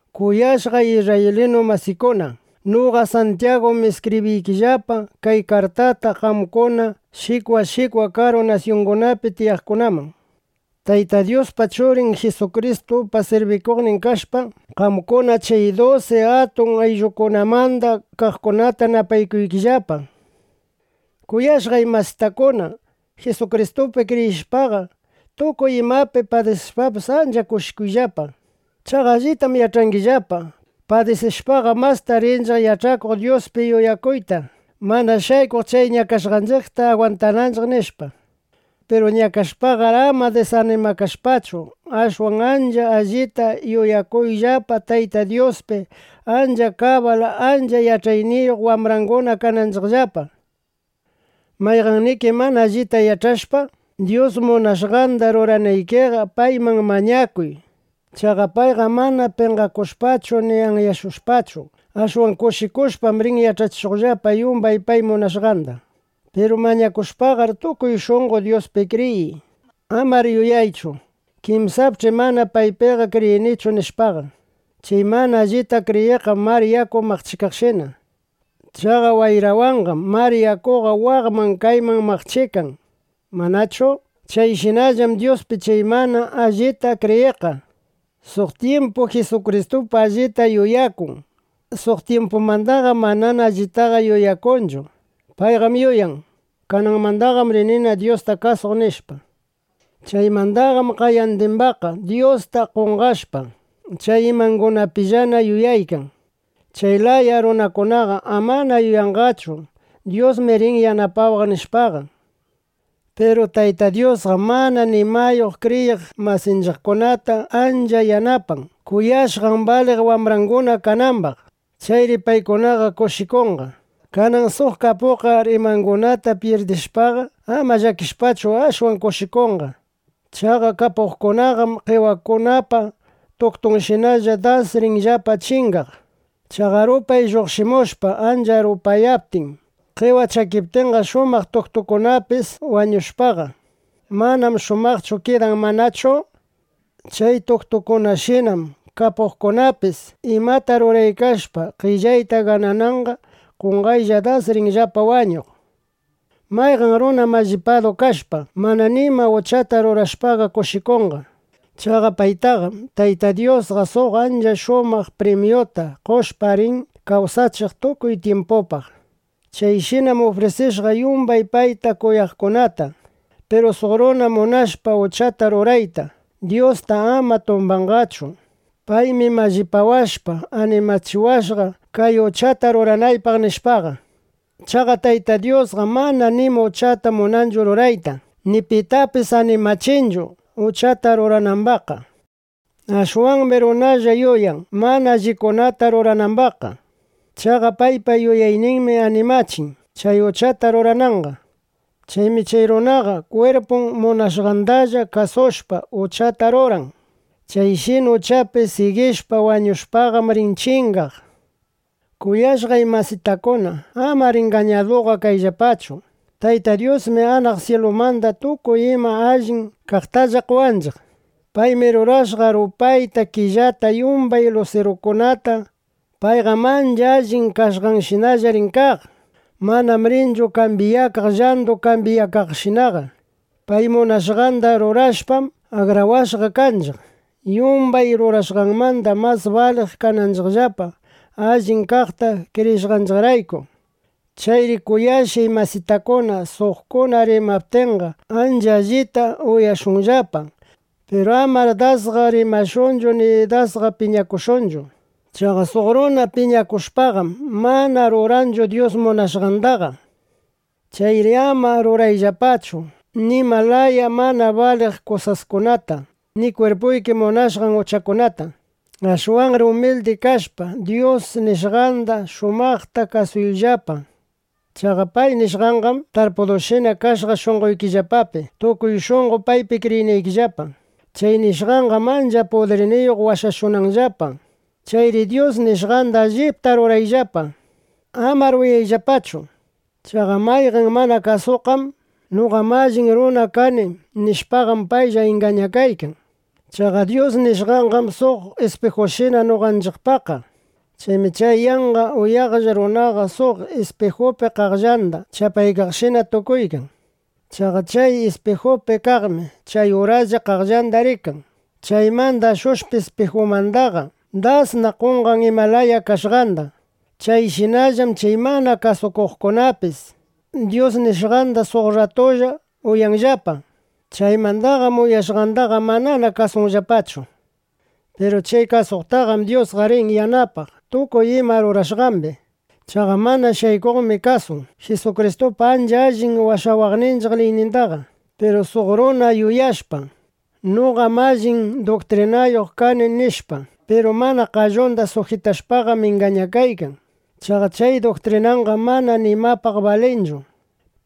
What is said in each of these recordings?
Kuyashqay isrraylinu masikuna, noqa Santyagum iskibriykillapa kay kartata qamkuna shikwa shikwa karu nasyungunapi tiyaqkunaman. Tayta Dyuspa, Churin Jisukristupa sirbikuqnin kashpa, qamkuna chay dusi atun ayllukunamanda kaqkunata napaykuykillapa. Kuyashqay masitakuna, Jisukristupi kriyishpaqa, tukuy imapi padisishpapis, ancha kushikuyllapa. Chaqa allitam yach'angillapa: Padisishpaqam, masta rinchiq yach'akuq Dyuspi yuyakuyta, mana shaykuq chay ñakashqanchiqta agwantananchiq, nishpa. Piru ñakashpaqar, ama disanimakashpachu, ashwan ancha allita yuyakuyllapa Tayta Dyuspi, ancha kabal, ancha yach'ayniyuq wambranguna kanaykillapa. Mayqanniki mana allita yach'ashpa Dyus munashqanda ruranaykiqa, payman mañakuy. Chaqa payqam mana penqashushpachu ni anyashushpachu, ashwan kushikushpa rin yach'achishuqllapa yumbay pay munashqanda. Piru mañakushpaqar, tukuy shunqo Dyuspi kriyiy. Amar yuyaychu: Kinsapch'i mana paypiqa kriyinichu, nishpaqa. Chay mana allita kriyiqqam mar yaku maqchikaqshina. Chaqa wayrawanqam mar yakuqa waqman kayman maqchikan, ¿manachu? (Chayshinallam Dyuspi chay mana allita kriyiqqa. Suq tyimpu Jisukristupi allita yuyakun, suq tyimpumandaqa manana allitachu yuyakun.) Payqam yuyan: Kananmandam rinina Dyusta kasuq, nishpa. Chaymandaqam qayandimbaqqa Dyusta qonqashpa, chay imangunapillana yuyaykan. Chay laya runakunaqa amana yuyanqachu: Dyusmi rin yanapawaq, nishpaqa. Piru Tayta Dyusqam mana nimayuq kriyiq masinchiqkunata ancha yanapan, kuyashqan baliq wambranguna kanambaq. Chayri paykunaqa kushikunqa. Kanan suq kapuqqar imangunata pyirdishpaqa, ama llakishpachu, ashwan kushikunqa. Chaqa kapuqkunaqam qewakunapa tuktunshinalla das rinllapa chingaq. Chaqa rupay lluqshimushpa ancha rupayaptin, qewa chakiptinqa, shumaq tuktungunapis wañushpaqa, manam shumaqchu kidan, ¿manachu? Chay tuktukunashinam kapuqkunapis imata ruraykashpa qellayta ganananqa, qonqaylla das rinllapa wañuq. Mayqan runa mallipadu kashpa, mana nima uchata rurashpaqa kushikunqa. Chaqa paytaqam Tayta Dyusqa suq ancha shumaq primyuta qoshpa, rin kawsachiq tukuy tyimpupaq. Chayshinam ufrisishqa yumbay payta kuyaqkunata. Piru suq runa munashpa uchata rurayta, Dyusta ama tumbanqachu: “Paymi mallipawashpa, animachiwashqa, kay uchata ruranaypaq”, nishpaqa. Chaqa Tayta Dyusqam mana nima uchata munanchu rurayta, ni pitapis animachinchu, uchata ruranambaqqa. Ashwanmi runalla yuyan, mana allikunata ruranambaqqa. Chaqa paypa yuyayninmi animachin, chay uchata rurananqa. Chaymi chay runaqa kwirpun munashqandalla kasushpa, uchata ruran. Chayshina uchapi sigishpa, wañushpaqam, rin chingaq. Kuyashqay masitakuna, amar ingañaduqa kayllapachu. Tayta Dyusmi anaq syilumanda tukuy ima allin kaqtalla qowanchiq. Paymi rurashqa rupayta, killata, yumbay lusirukunata. Payqam ancha allin kashqanshinalla rin kaq. Manam rinchu kambyakaq, llandu kambyakaqshinaqa. Pay munashqanda rurashpam, akrawashqa kanchiq, yumbay rurashqanmanda mas baliq kananchiqllapa, allip kaqta kriyishqanchiqrayku. Chayri kuyashqay masitakuna, suqkuna rimaptinqa, ancha allita uyashunllapa. Piru amar dasqa rimashunchu ni dasqa piñakushunchu. Chaqa suq runa piñakushpaqam, mana ruranchu Dyus munashqandaqa. Chayri ama rurayllapachu nima laya mana baliq kusaskunata ni kwirpuyki munashqan uchakunata. Ashwanri umildi kashpa, Dyus nishqanda shumaqta kasuyllapa. Chaqa pay nishqanqam tarpushqashina kashqa shunqoykillapapi, tukuy shunqo paypi kriyinaykillapa. Chay nishqanqam ancha pudirniyuq washashunanllapa. Chayri Dyus nishqanda allipta rurayllapa. Amar uyayllapallachu. Chaqa mayqan mana kasuqqa: “Noqam allin runa kani”, nishpaqam, paylla ingañakaykan. Chaqa Dyus nishqanqam suq ispijushina noqanchiqpaqqa. Chaymi chay yanqa uyaqlla runaqa suq ispijupi qaqllanda chapaykaqshina tukuykan. Chaqa chay ispijupi kaqmi chay uraslla qaqllandaqa rikan. Chaymanda ashushpa ispijumandaqa, dasna qonqan ima laya kashqandaqa. (Chayshinallam chay mana kasukuqkunapis Dyus nishqanda suq rratupaqlla uyanllapa. Chaymandaqam uyashqandaqa manana kasunllapachu.) Piru chay kasuqtaqam Dyusqa rin yanapaq tukuy ima rurashqambi. Chaqa mana shaykuqmi kasun Jisukristupa ancha allin washawaqninchiq liynindaqa. Piru suq runa yuyashpa: Noqam allin duktrinayuq kani, nishpa, piru mana qallunda sujitashpaqam, ingañakaykan. Chaqa chay duktrinanqam mana nimapaq balinchu.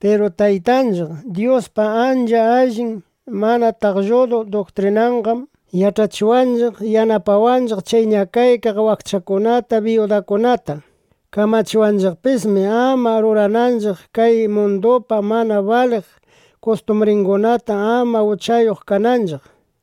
Piru Taytanchiq Dyuspa ancha allin mana taqlludu duktrinanqam yach'achiwanchiq, yanapananchiq chay ñakaykaq wakchakunata, biyudakunata. Kamachiwanchiqpismi, ama rurananchiq kay mundupa mana baliq kustumbringunata, ama uchayuq kananchiq.